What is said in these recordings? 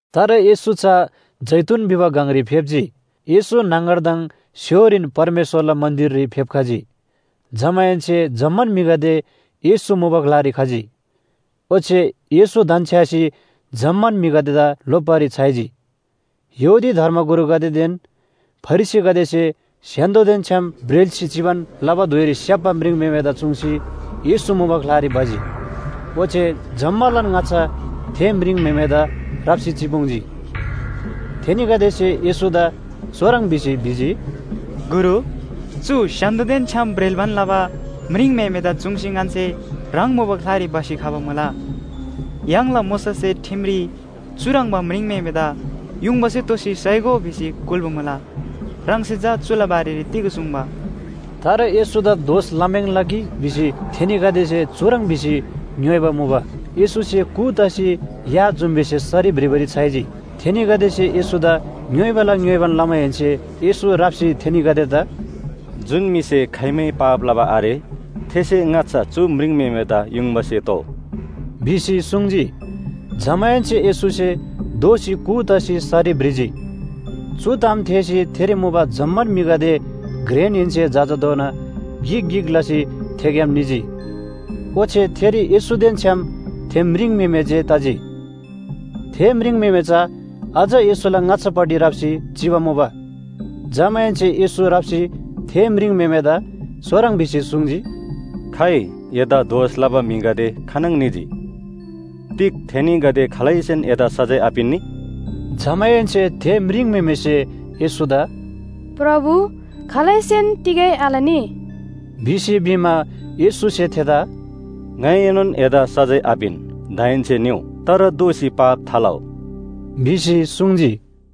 तर येशू चा जैतून भिबा गङरी फेप्‍जी। येशू न्‍हङगरदङ स्‍य्‍होरीन परमेश्‍वरला मन्‍दिररी फेप्‍खजी। जमाहेन्‍से जम्‍मान म्‍हिगदे येशू मुबा ग्‍लारी खजी। ओच्‍छे येशू धन्‍छ्‌यासी जम्‍मान म्‍हिगदेदा लोप्‍बारी छ्‌याइजी। यहूदी धर्मगुरुगदेदेन फरिसीगदेसे स्‍य्‍हान्‍दोदेन छ्‌याम ब्रेल्‍सी चिबान लबा धुइरी स्‍याप्‍बा म्रिङम्‍हेमेदा चुङ्सी येशू मुबा ग्‍लारी भजी। ओच्‍छे जम्‍मालान ङाच्‍छा थे म्रिङम्‍हेमेदा राप्‍सी चिपुङ्जी। थेनीगदेसे येशूदा चुह्रङ् भिसी भिजी, “गुरु, चु स्‍य्‍हान्‍दोदेन छ्‌याम ब्रेल्‍बान लबा म्रिङम्‍हेमेदा चुङ्सी ङन्‍से ह्राङ मुबा ग्‍लारी भसी खबा मुला। य्‍हाङला मोशासे ठिमरी चुह्रङ्बा म्रिङम्‍हेमेदा युङबासे तोसी साइगो भिसी कुल्‍बा मुला। ह्राङसे चा चुला बारेरी तिग सुङ्बा?” तर येशूदा दोष लम्‍याङ्ला कि भिसी थेनीगदेसे चुह्रङ् भिसी ङ्‌योइबा मुबा। येशूसे कू तसी या जुम्‍बीसे सरी भ्रिबारी छ्‌याइजी। थेनीगदेसे येशूदा ङ्‌योइबाला ङ्‍योइबान लमाहेन्‍से येशू राप्‍सी थेनीगदेदा “जुन म्‍हिसे खाइमै पाप लबा आरे थेसे ङाच्‍छा चु म्रिङम्‍हेमेदा युङबासे तोउ” भिसी सुङ्जी। जमाहेन्‍से येशूसे दोःसी कू तसी सरी भ्रिजी। चु ताम थेःसी थेरी मुबा जम्‍मान म्‍हिगदे घ्रेनहेन्‍से जजाधोना गिक गिक लसी थेग्‍याम निजी। ओच्‍छे थेरी येशूदेन छ्‌याम थे म्रिङम्‍हेमे जे तजी। थे म्रिङम्‍हेमे चा अझ येशूला ङाच्‍छापट्टि राप्‍सी चिबा मुबा। जमाहेन्‍से येशू राप्‍सी थे म्रिङम्‍हेमेदा चुह्रङ् भिसी सुङ्जी, “खाइ, एदा दोष लबा म्‍हिगदे खानङ निजी? तिग थेनीगदे खालैसेन एदा सजाय आपिन्‍नी?” जमाहेन्‍से थे म्रिङम्‍हेमेसे येशूदा “प्रभु, खालैसेन तिगै आलनी” भिसी भिमा, येशूसे थेदा “ङाइएनोन एदा सजाय आपिन, दाहेन्‍से निउ, तर दोःसी पाप थालउ” भिसी सुङ्जी।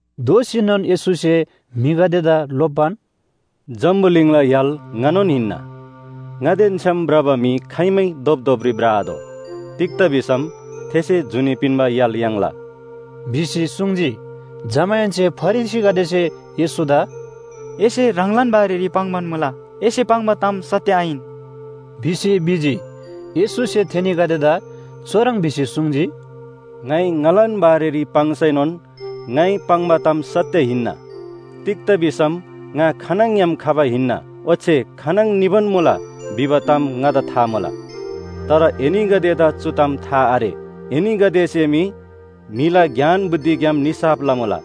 दोःसीनोन येशूसे म्‍हिगदेदा लोप्‍बान, “जम्‍बुलिङला य्‍हाल ङानोन हिन्‍ना। ङादेन छ्‌याम भ्रबा म्‍हि खाइमै धोपधोपरी भ्रआतोः। तिग्‍दा भिसम थेसे जुनी पिन्‍बा य्‍हाल याङ्ला” भिसी सुङ्जी। जमाहेन्‍से फरिसीगदेसे येशूदा “एसे ह्राङलान बारेरी पाङ्‌बान मुला, एसे पाङ्बा ताम सत्‍य आहिन” भिसी भिजी। येशूसे थेनीगदेदा चुह्रङ् भिसी सुङ्जी, “ङाइ ङालान बारेरी पाङ्सैनोन ङाइ पाङ्बा ताम सत्‍य हिन्‍ना। तिग्‍दा भिसम ङा खानङग्‍याम खबा हिन्‍ना, ओच्‍छे खानङ निबान मुला भिबा ताम ङादा था मुला। तर एनीगदेदा चु ताम था आरे। एनीगदेसे मी म्‍हिला ज्ञान बुद्धिग्‍याम निसाफ लमुला।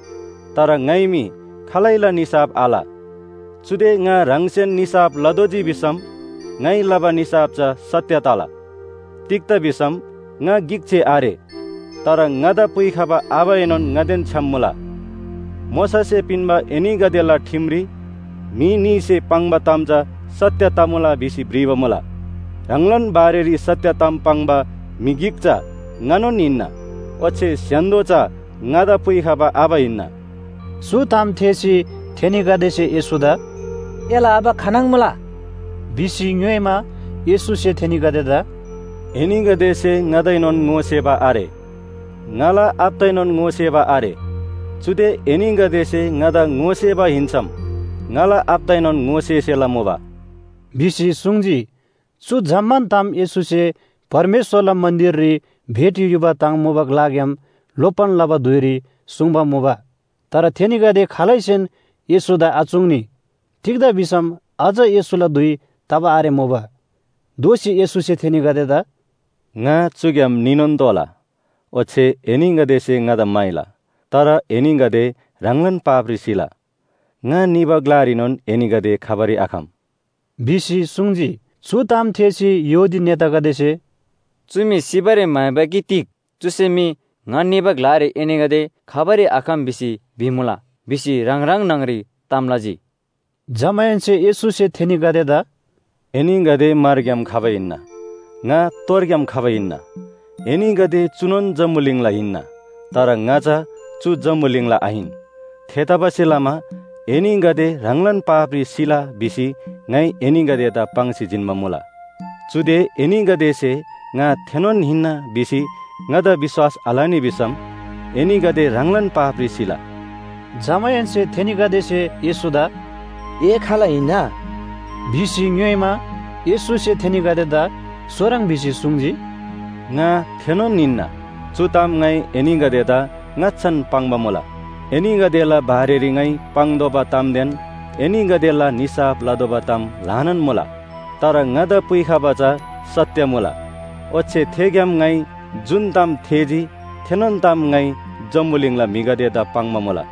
तर ङाइ मी खालैला निसाफ आल। चुदे ङा ह्राङसेन निसाफ लतोःजी भिसम ङाइ लबा निसाफ चा सत्‍य तला। तिग्‍दा भिसम ङा गिक जे आरे, तर ङादा पुइखबा आबाएनोन ङादेन छ्‌याम मुला। मोशासे पिन्‍बा एनीगदेला ठिमरी म्‍हि न्‍हीसे पाङ्बा ताम चा सत्‍य तमुला भिसी भ्रिबा मुला। ह्राङलान बारेरी सत्‍य ताम पाङ्बा म्‍हि गिक चा ङानोन हिन्‍ना, ओच्‍छे स्‍य्‍हान्‍दो चा ङादा पुइखबा आबा हिन्‍ना।” चु ताम थेःसी थेनीगदेसे येशूदा “एला आबा खानङ मुला?” भिसी ङ्‌योइमा, येशूसे थेनीगदेदा “एनीगदेसे ङादाएनोन ङोसेबा आरे, ङाला आबादाएनोन ङोसेबा आरे। चुदे एनीगदेसे ङादा ङोसेबा हिन्‍सम ङाला आबादाएनोन ङोसेसेला मुबा” भिसी सुङ्जी। चु जम्‍मान ताम येशूसे परमेश्‍वरला मन्‍दिररी भेटी युबा ताङ मुबा ग्‍लाग्‍याम लोप्‍बान लबा धुइरी सुङ्बा मुबा। तर थेनीगदे खालैसेन येशूदा आचुङ्नी। तिग्‍दा भिसम अझ येशूला धुइ तबा आरेमुबा। दोःसी येशूसे थेनीगदेदा “ङा चुग्‍याम निनोन निला, ओच्‍छे एनीगदेसे ङादा म्‍हाइला। तर एनीगदे ह्राङलान पापरी सिला। ङा निबा ग्‍लारीनोन एनीगदे खबारी आखम” भिसी सुङ्जी। चु ताम थेःसी यहूदी नेतागदेसे “चु म्‍हि सिबारी म्‍हाइबा कि तिग? चुसे मी ‘ङा निबा ग्‍लारी एनीगदे खबारी आखम भिसी भिमुला’ भिसी ह्राङ ह्राङ न्‍हङ‍री ताम लजी।” जमाहेन्‍से येशूसे थेनीगदेदा “एनीगदे मारग्‍याम खबा हिन्‍ना, ङा तोरग्‍याम खबा हिन्‍ना। एनीगदे चुनोन जम्‍बुलिङला हिन्‍ना, तर ङा चा चु जम्‍बुलिङला आहिन। थेतबासेलमा ‘एनीगदे ह्राङलान पापरी सिला’ भिसी ङाइ एनीगदेदा पाङ्सी जिन्‍बा मुला। चुदे एनीगदेसे ‘ङा थेनोन हिन्‍ना’ भिसी ङादा विश्‍वास आलनी भिसम एनीगदे ह्राङलान पापरी सिला।” जमाहेन्‍से थेनीगदेसे येशूदा “ए खाल हिन्‍ना?” भिसी ङ्‌योइमा, येशूसे थेनीगदेदा चुह्रङ् भिसी सुङ्जी, “ङा थेनोन हिन्‍ना, चु ताम ङाइ एनीगदेदा ङाच्‍छान पाङ्बा मुला। एनीगदेला बारेरी ङाइ पाङ्तोःबा तामदेन एनीगदेला निसाफ लतोःबा ताम ल्‍हानान मुला। तर ङादा पुइखबा चा सत्‍य मुला, ओच्‍छे थेग्‍याम ङाइ जुन ताम थेःजी थेनोन ताम ङाइ जम्‍बुलिङला म्‍हिगदेदा पाङ्बा मुला।”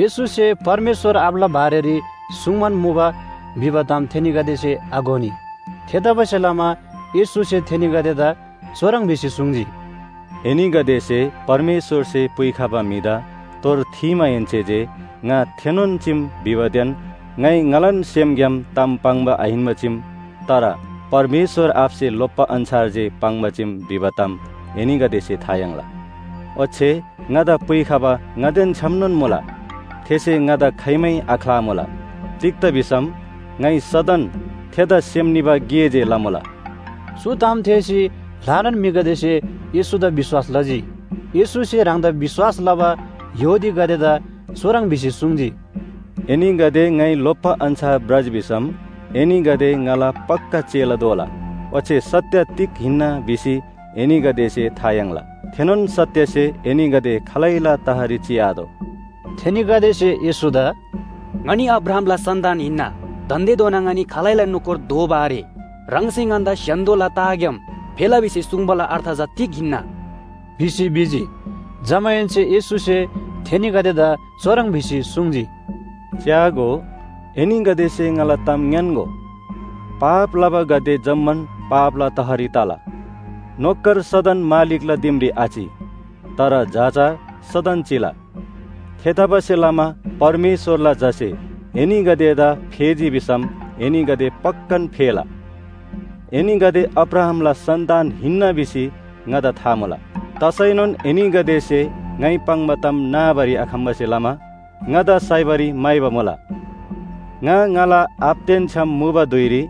येशूसे परमेश्‍वर आबाला बारेरी सुङ्बान मुबा भिबा ताम थेनीगदेसे आघोनी। थेतबासेलमा येशूसे थेनीगदेदा चुह्रङ् भिसी सुङ्जी, “एनीगदेसे परमेश्‍वरसे पुइखबा म्‍हिदा तोर थीमाहेन्‍से जे ङा थेनोन चीम भिबादेन ङाइ ङालान सेमग्‍याम ताम पाङ्बा आहिन्‍बा चीम, तर परमेश्‍वर आबासे लोप्‍बा अन्‍छार जे पाङ्बा चीम भिबा ताम एनीगदेसे था याङ्ला। ओच्‍छे ङादा पुइखबा ङादेन छ्‌यामनोन मुला, थेसे ङादा खाइमै आख्‍लामुला। तिग्‍दा भिसम ङाइ सदन थेदा सेम निबा गे जे लमुला।” चु ताम थेःसी ल्‍हानान म्‍हिगदेसे येशूदा विश्‍वास लजी। येशूसे ह्राङदा विश्‍वास लबा यहूदीगदेदा चुह्रङ् भिसी सुङ्जी, “एनीगदे ङाइ लोप्‍बा अन्‍छार भ्रजी भिसम एनीगदे ङाला पक्‍का चेला दोला। ओच्‍छे सत्‍य तिग हिन्‍ना भिसी एनीगदेसे था याङ्ला, थेनोन सत्‍यसे एनीगदे खालैला तहरी चिआतोः।” थेनीगदेसे येशूदा “ङनी अब्राहामला सन्‍तान हिन्‍ना, दान्‍देधोना ङनी खालैला नोकर दोबा आरे। ह्राङसे ङन्‍दा स्‍य्‍हान्‍दोला तहग्‍याम फेला भिसी सुङ्बाला अर्थ चा तिग हिन्‍ना?” भिसी भिजी। जमाहेन्‍से येशूसे थेनीगदेदा चुह्रङ् भिसी सुङ्जी, “च्‍यागो, एनीगदेसे ङाला ताम ङ्‌यान्‍गो, पाप लबागदे जम्‍मान पापला तहरी तला। नोकर सदन मालिकला दिमरी आचि, तर झा चा सदन चिला। थेतबासेलमा परमेश्‍वरला झासे एनीगदेदा फेजी भिसम एनीगदे पक्‍कान फेला। एनीगदे अब्राहामला सन्‍तान हिन्‍ना भिसी ङादा था मुला। तसैनोन एनीगदेसे ङाइ पाङ्बा ताम नाबारी आखम्‍बासे लमा ङादा साइबारी म्‍हाइबा मुला। ङा ङाला आबादेन छ्‌याम मुबा धुइरी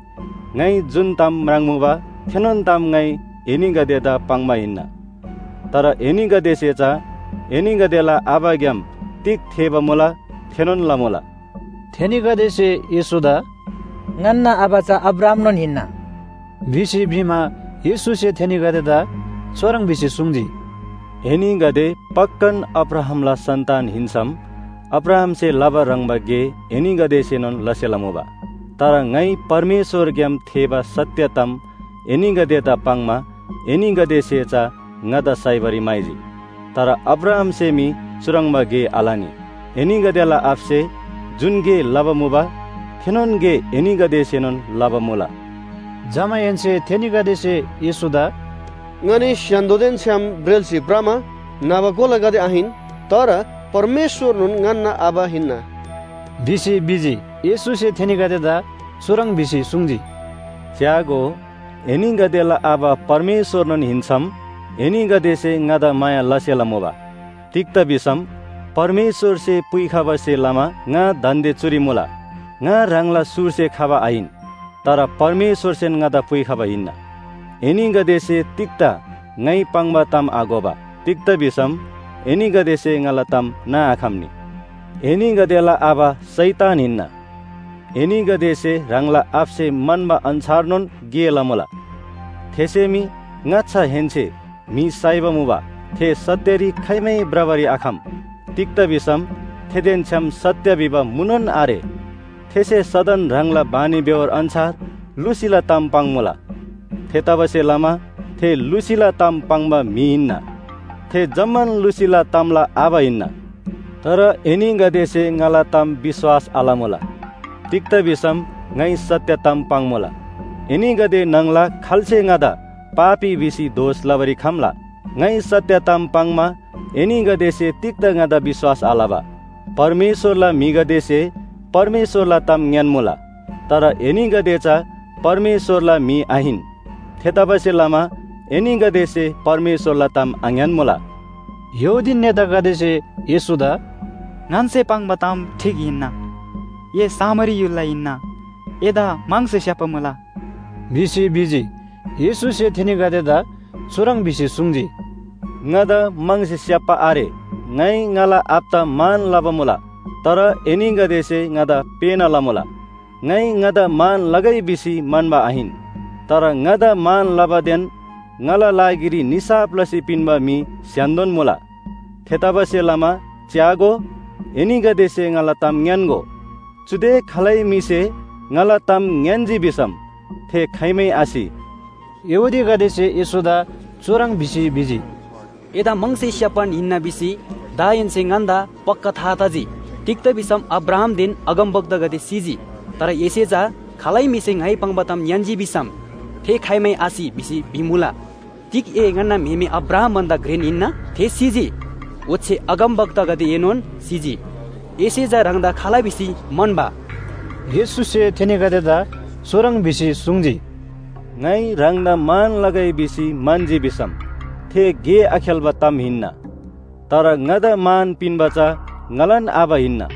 ङाइ जुन ताम म्राङ्मुबा, थेनोन ताम ङाइ एनीगदेदा पाङ्बा हिन्‍ना। तर एनीगदेसे चा एनीगदेला आबाग्‍याम तिग थेःबा मुला थेनोन लमुला।” थेनीगदेसे येशूदा “ङन्‍ना आबा चा अब्राहामनोन हिन्‍ना” भिसी भिमा, येशूसे थेनीगदेदा चुह्रङ् भिसी सुङ्जी, “एनीगदे पक्‍कान अब्राहामला सन्‍तान हिन्‍सम अब्राहामसे लबा ह्रङ्‌बा गे एनीगदेसेनोन लसेला मुबा। तर ङाइ परमेश्‍वरग्‍याम थेःबा सत्‍य ताम एनीगदेदा पाङ्‌मा एनीगदेसे चा ङादा साइबारी म्‍हाइजी। तर अब्राहामसे मी चुह्रङ्बा गे आलनी। एनीगदेला आबासे जुन गे लबा मुबा, थेनोन गे एनीगदेसेनोन लबा मुला।” जमाहेन्‍से थेनीगदेसे येशूदा “ङनी स्‍य्‍हान्‍दोदेन छ्‌याम ब्रेल्‍सी भ्रमा न्‍हबा कोलागदे आहिन, तर परमेश्‍वरनोन ङन्‍ना आबा हिन्‍ना” भिसी भिजी। येशूसे थेनीगदेदा चुह्रङ् भिसी सुङ्जी, “च्‍यागो, एनीगदेला आबा परमेश्‍वरनोन हिन्‍सम एनीगदेसे ङादा माया लसेला मुबा। तिग्‍दा भिसम परमेश्‍वरसे पुइखबासे लमा ङा दान्‍दे चुरी मुला। ङा ह्राङला सुरसे खबा आहिन, तर परमेश्‍वरसेन ङादा पुइखबा हिन्‍ना। एनीगदेसे तिग्‍दा ङाइ पाङ्बा ताम आघोबा? तिग्‍दा भिसम एनीगदेसे ङाला ताम नाआखम्‍नी। एनीगदेला आबा शैतान हिन्‍ना, एनीगदेसे ह्राङला आबासे म्‍हन्‍बा अन्‍छारनोन गे लमुला। थेसे मी ङाच्‍छाहेन्‍से म्‍हि साइबा मुबा, थे सत्‍यरी खाइमै भ्रबारी आखम। तिग्‍दा भिसम थेदेन छ्‌याम सत्‍य भिबा मुनोन आरे। थेसे सदन ह्राङला बानीबेहोर अन्‍छार लुसीला ताम पाङ्‌मुला। थेतबासेलमा थे लुसीला ताम पाङ्बा म्‍हि हिन्‍ना, थे जम्‍मान लुसीला तामला आबा हिन्‍ना। तर एनीगदेसे ङाला ताम विश्‍वास आलमुला। तिग्‍दा भिसम ङाइ सत्‍य ताम पाङ्‌मुला। एनीगदे न्‍हङला खाल्‍से ङादा पापी भिसी दोष लबारी खम्‍ला? ङाइ सत्‍य ताम पाङ्‌मा एनीगदेसे तिग्‍दा ङादा विश्‍वास आलबा? परमेश्‍वरला म्‍हिगदेसे परमेश्‍वरला ताम ङ्‍यान्‍मुला। तर एनीगदे चा परमेश्‍वरला म्‍हि आहिन। थेतबासेलमा एनीगदेसे परमेश्‍वरला ताम आङ्‌यान्‍मुला।” यहूदी नेतागदेसे येशूदा “ङन्‍से पाङ्बा ताम ठीक हिन्‍ना। ए सामरी य्‍हुलला हिन्‍ना, एदा म्‍हङसे स्‍याप्‍बा मुला” भिसी भिजी। येशूसे थेनीगदेदा चुह्रङ् भिसी सुङ्जी, “ङादा म्‍हङसे स्‍याप्‍बा आरे। ङाइ ङाला आबादा मान लबा मुला, तर एनीगदेसे ङादा पेःना लमुला। ङाइ ङादा मान लगै भिसी म्‍हन्‍बा आहिन, तर ङादा मान लबादेन ङाला लागिरी निसाफ लसी पिन्‍बा म्‍हि स्‍य्‍हान्‍दोन मुला। थेतबासेलमा च्‍यागो, एनीगदेसे ङाला ताम ङ्‌यान्‍गो, चुदे खालै म्‍हिसे ङाला ताम ङ्‌यान्‍जी भिसम थे खाइमै आसि।” यहूदीगदेसे येशूदा चुह्रङ् भिसी भिजी, “एदा म्‍हङसे स्‍याप्‍बान हिन्‍ना भिसी दाहेन्‍से ङन्‍दा पक्‍का था तजी। तिग्‍दा भिसम अब्राहामदेन अगमवक्तागदे सिजी, तर एसे चा ‘खालै म्‍हिसे ङाइ पाङ्बा ताम ङ्‌यान्‍जी भिसम थे खाइमै आसि’ भिसी भिमुला। तिग ए ङन्‍ना म्‍हेमे अब्राहाम भन्‍दा घ्रेन हिन्‍ना? थे सिजी, ओच्‍छे अगमवक्तागदेएनोन सिजी। एसे चा ह्राङदा खाल भिसी म्‍हन्‍बा?” येशूसे थेनीगदेदा चुह्रङ् भिसी सुङ्जी, “ङाइ ह्राङदा मान लगै भिसी म्‍हन्‍जी भिसम थे गे आखेल्‍बा ताम हिन्‍ना। तर ङादा मान पिन्‍बा चा ङालान आबा हिन्‍ना,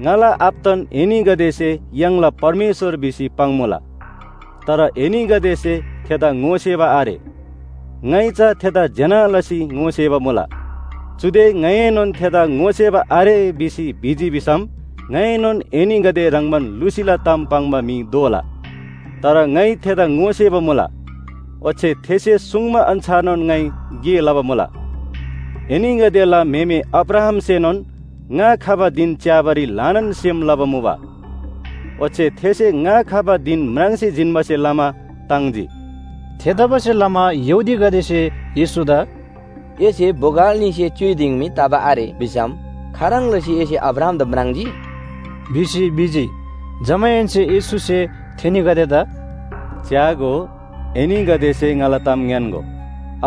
ङाला आबादान एनीगदेसे य्‍हाङला परमेश्‍वर भिसी पाङ्‌मुला। तर एनीगदेसे थेदा ङोसेबा आरे। ङाइ चा थेदा ज्‍यना लसी ङोसेबा मुला। चुदे ङाइएनोन थेदा ङोसेबा आरे भिसी भिजी भिसम ङाएनोन एनीगदे ह्रङ्‌बान लुसीला ताम पाङ्बा म्‍हि दोला। तर ङाइ थेदा ङोसेबा मुला, ओच्‍छे थेसे सुङ्बा अन्‍छारनोन ङाइ गे लबा मुला। एनीगदेला म्‍हेमे अब्राहामसेनोन ङा खबा धिन च्‍याबारी ल्‍हानान सेम लबा मुबा। ओच्‍छे थेसे ङा खबा धिन म्राङ्सी जिन्‍बासे लमा ताङ्जी।” थेतबासेलमा यहूदीगदेसे येशूदा “एसे बोगल न्‍हीसे च्‍युइ दिङ मी तबा आरे भिसम खाह्रङ् लसी एसे अब्राहामदा म्राङ्जी?” भिसी भिजी। जमाहेन्‍से येशूसे थेनीगदेदा “च्‍यागो, एनीगदेसे ङाला ताम ङ्‌यान्‍गो,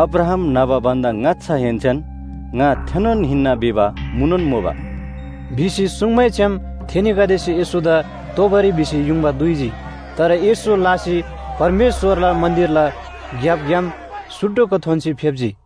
अब्राहाम न्‍हबा भन्‍दा ङाच्‍छाहेन्‍सेन ‘ङा थेनोन हिन्‍ना’ भिबा मुनोन मुबा” भिसी सुङ्मैछ्‌याम, थेनीगदेसे येशूदा तोबारी भिसी युङबा दुइजी। तर येशू लासी परमेश्‍वरला मन्‍दिरला ग्‍यापग्‍याम सुटुक्‍क थोन्‍सी फेप्‍जी।